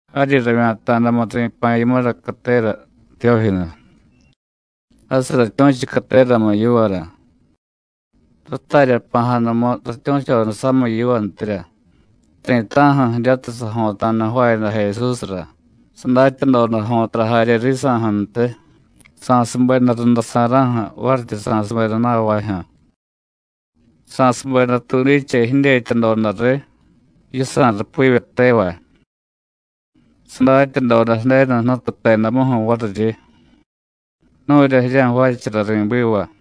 Jaryi ravya̱ta̱damu ri̱pa̱ yimura catera, Tiyójinu. Jasiy ratyu̱chu cateramu yivara. Ratarya jpa̱jadamu ratyu̱choda samiy yivantirya ti̱ta̱ju̱ jiryatiy sajo̱ta̱da jvaayada Jesúsra, sadatyadoda jo̱tara jarye risa̱ju̱ntiy, sa̱subeda runda sa̱ra̱ju̱, varityi sa̱subeda na̱vajyu̱. Sa̱subeda tuudiche jidyetyadoda riy yisa̱ rupivye tevay. Sadatyadoda Ju̱denu Jnutu jtedamuju̱ variryi: “Nu̱rya jirya̱jvaachara ri̱biva.”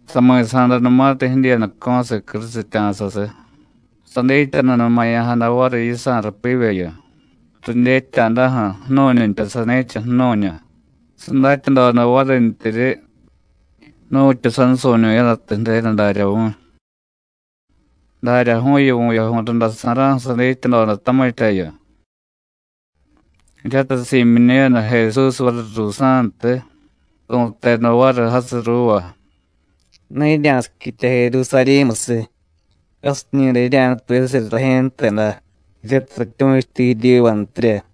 Sami̱sa̱danumatiy jidyiiyadaco̱siy crusitya̱sasiy, sadityanunumaya̱jada variy yisa̱ rúpivyeyu, ridyetya̱daju̱, ju̱nu̱ñuntya sani̱cha, ju̱nu̱ñu; sadatyadoda varintyiryi nu̱tyu sansu̱ñu̱yadatiy Ju̱denu darya vu̱y. Daryaju̱yu vu̱yaju̱y runda sa̱ra̱ju̱ sadityadoda tamityayu. Jiryatiy si̱myiñu̱yada Jesús variy ruusa̱ntiy, su̱teda variy jasiy ruuva: “Ne jirya̱siquitya Jerusarí̱musiy. Jasiñi̱day jirya̱nutuyasirya Rajye̱ jteda, jiryatiy ratyu̱chuti jiryivantirya.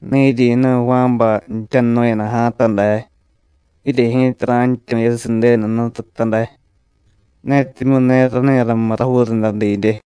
Ne jiryi̱nu̱y Juánbay jtyanunu̱yada ja̱a̱ta day, jirye ji̱ta ra̱jtyu̱yasiy Ju̱denu Jnututa day, netimyu̱ ne rani ramiy rajuu runda didye.”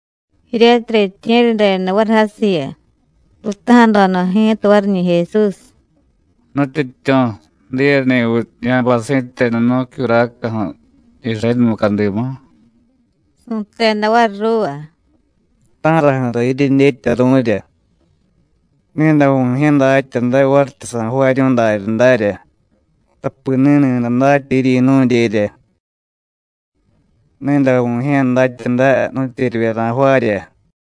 Jiryatiy riintye̱ryadeda variy jasiyu, ruutaja̱doda ji̱ta variñi̱ Jesús: “¿Nutyityu̱, diyeni̱viy ya̱bay si̱tenu nu̱cyuracaju̱ Irayénu mucadimu?” Su̱teda variy ruuva: “¿Ta̱raju̱ra jiryedyetyaru̱rya? Ni̱day Vu̱jye̱ datya day varityi sa̱jvaaryu̱y daryadarya, tapi ni̱ni̱day datya jiryi̱nu̱dyerya. Ni̱day Vu̱jye̱ datya day nu̱tyeryivye ra̱jvaarya.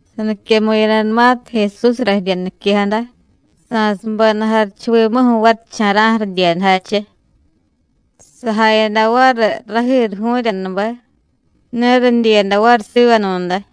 Saniquemu̱yadanumatiy Jesúsra jirya niquejada, sa̱subeda jarichuvimuju̱ varicha̱ra̱ju̱ ridyiyadajache. Sajayada variy rajiruju̱ryanube, ne ridyiyada variy sivanu̱day.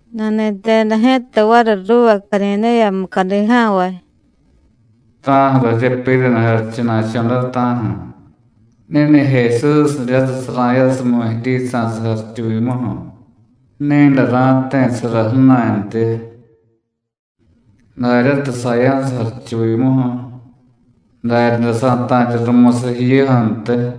Nani̱teda ji̱ta variy ruuva Cadidéya mucadi ja̱nvay: “¿Ta̱ju̱ra jiryepyiraniy jarichuna̱cho̱ day, ta̱ju̱? Ni̱ni̱ Jesús jiryatiy sara̱yasumiy jiryisa̱siy jarichuvimuju̱, ni̱day ra̱jti̱sara ju̱na̱ntyi. Daryatiy saya̱siy jarichuvimuju̱, daryaday sa̱ta̱rya rumusiy jiyuju̱ntiy.”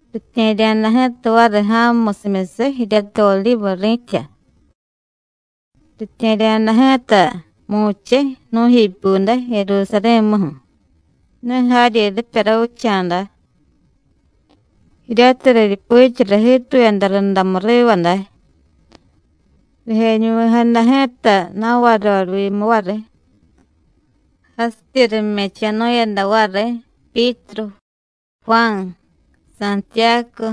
Ritye̱rya̱da ji̱ta variy ja̱mumusimyusiy jiryatiy Odivu ri̱tya. Ritye̱rya̱da ji̱ta mu̱chiy nu̱jipyude Jerusarí̱muju̱, ne jaryi ripya ravicha̱da, jiryatiy riryupichara jiituyada rundamu riva day. Rijeñuvi̱jada ji̱ta na̱varyorivyimu variy, jasityi rime̱cho̱nu̱yada variy Pyítru, Juán, Santiyácu,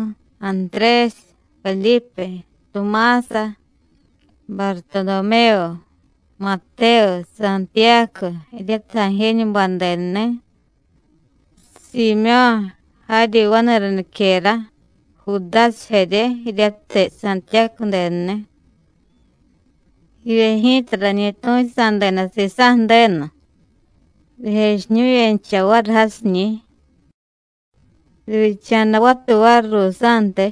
Antrésiy, Vedípe, Tumása, Bartodomévu, Matévu, Santiyácu jiryatiy Ajéñubay denuni̱, Siimyó̱ jaryi vani̱ra niquera, Judásiy jarye jiryatiy Santiyácu denuni̱. Jivye ji̱ta rañi tu̱chutadeda sisa̱ Ju̱denu, rijechiñu̱yencha variy jasiñi̱. Rivyicha̱da vatuy variy ruusa̱ntiy,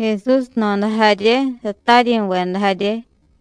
Jesús jno̱da jarye, sataryi̱veda jarye.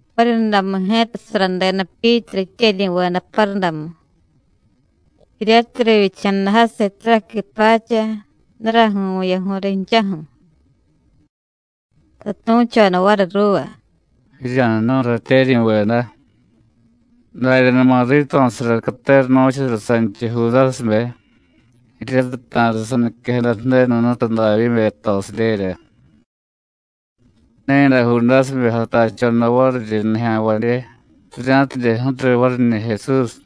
Variryundamu ji̱ta saradeda Pyítru jityeryi̱veda parudamu, jiryatiy rivyicha̱da jasiy taraqui pacha, daraju̱y vu̱yaju̱y rinchaju̱. Satu̱choda variy ruuva: “Jirya̱jnu̱y, ratyeryi̱veda, daryanuma rito̱sara catera nu̱chara sanchiy Judásibe, jiryatiy ta̱riy saniquejada Ju̱denu Jnutu Davyíbe jtosidyerya. Ni̱day Judásibe jatachoda variryi nijya̱nvadye, rirya̱tidye ju̱riy variñi̱ Jesús.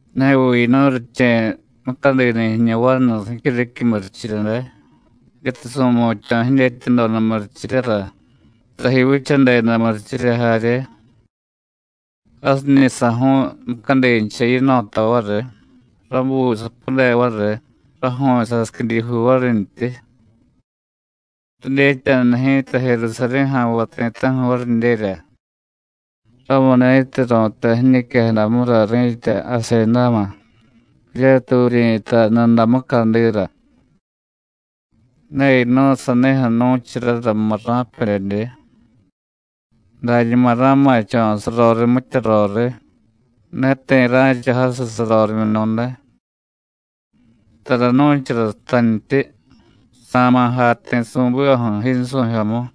Neviy yinu̱y riche̱ mucadini̱ jiñu vanu jicyuriquiy murichirya day, jiryatiy su̱mutya̱ jidyetyadoda murichiryara, taji vichadeda murichirya jarye. Jasiñi̱ saju̱u̱y mucadincha yino̱ta variy, rabuy sapude variy, raju̱u̱y sasiquidijuu varintyi. Ridyetya ji̱ta Jerusarí̱ ja̱nvay ti̱ta̱ju̱ varidyerya, ramuni̱tiy ru̱tay jiñiquejadamura ri̱tya Asendáma, jiryatiy vuryi̱tay Nuda mucadira. Ne yinu̱y sanijyu̱ nu̱charara murra̱pedyedye: Dañuma ra̱ma̱cho̱ saroriy mitya roriy, ne ti̱ ra̱cha jasiy sarorimyunu̱day. Tara nu̱chara jtantyi: Sa̱ma̱ jay ti̱ su̱bivaju̱, yinsu̱jyomu.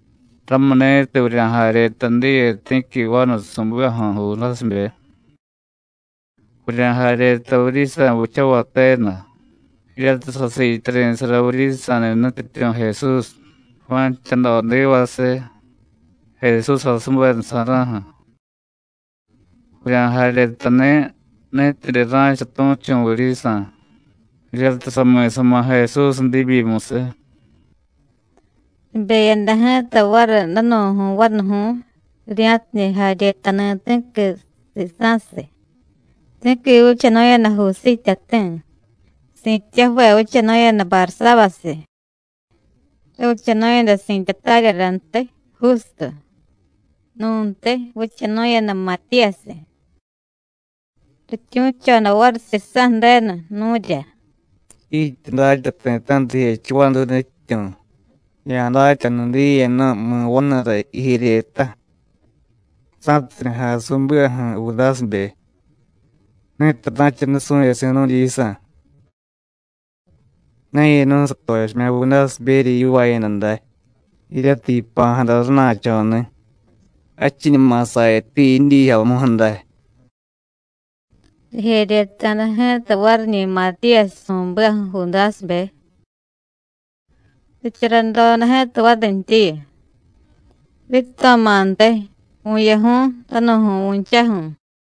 Ramuni̱tiy vurya̱jaryeta diye ti̱qui vanu su̱bivaju̱ Judásibe. Vurya̱jaryeta vuryisa̱ vichavay tenu, jiryatiy sasiityari̱sara vuryisa̱ni̱ Nutyityu̱ Jesús, Juán jtyadodivasiy, Jesús jasubedasa̱ra̱ju̱. Vurya̱jaryetani̱ ni̱tidye ra̱cha tu̱chu̱ vuryisa̱, jiryatiy sami̱sama̱ Jesús diibyimusiy.” Ribeyada ji̱ta variy danu̱ju̱y vanuju̱y, rirya̱tidye jaryetani̱ ti̱qui sisa̱siy. Ti̱qui vichanu̱yada Jusíy jtyati̱, si̱tyaju̱ve vichanu̱yada Barsábasiy, ravichanu̱yada si̱tya táryarantiy, Jústu. Nu̱ntiy vichanu̱yada Matíyasiy. Rityu̱choda variy Sisa̱ Ju̱denu, nu̱rya: “Jiityi datya ti̱ta̱ju̱ra rijechiy vaduy, Nutyityu̱, ya̱datyanu diye nu̱y, mi̱ vanura jijeryeta, sa̱tidye jay su̱bivaju̱ Judásibe, ni̱tiy ra̱cha nusu̱yasi̱ nu̱dyisa̱. Ne yinu̱y satochimya̱ Judásiberya yivaayada day, jiryatiy yipa̱jada rana̱cho̱ni̱, jadchiñuma sayati jidyiijyomuju̱ day.” Rijeryeta̱da ji̱ta variñi̱ Matíyasiy su̱bivaju̱ Judásibe. Richaradoda ji̱ta varintyiyu: “Rito̱ma̱ntiy, vu̱yaju̱y danu̱ju̱y vu̱nchaju̱.”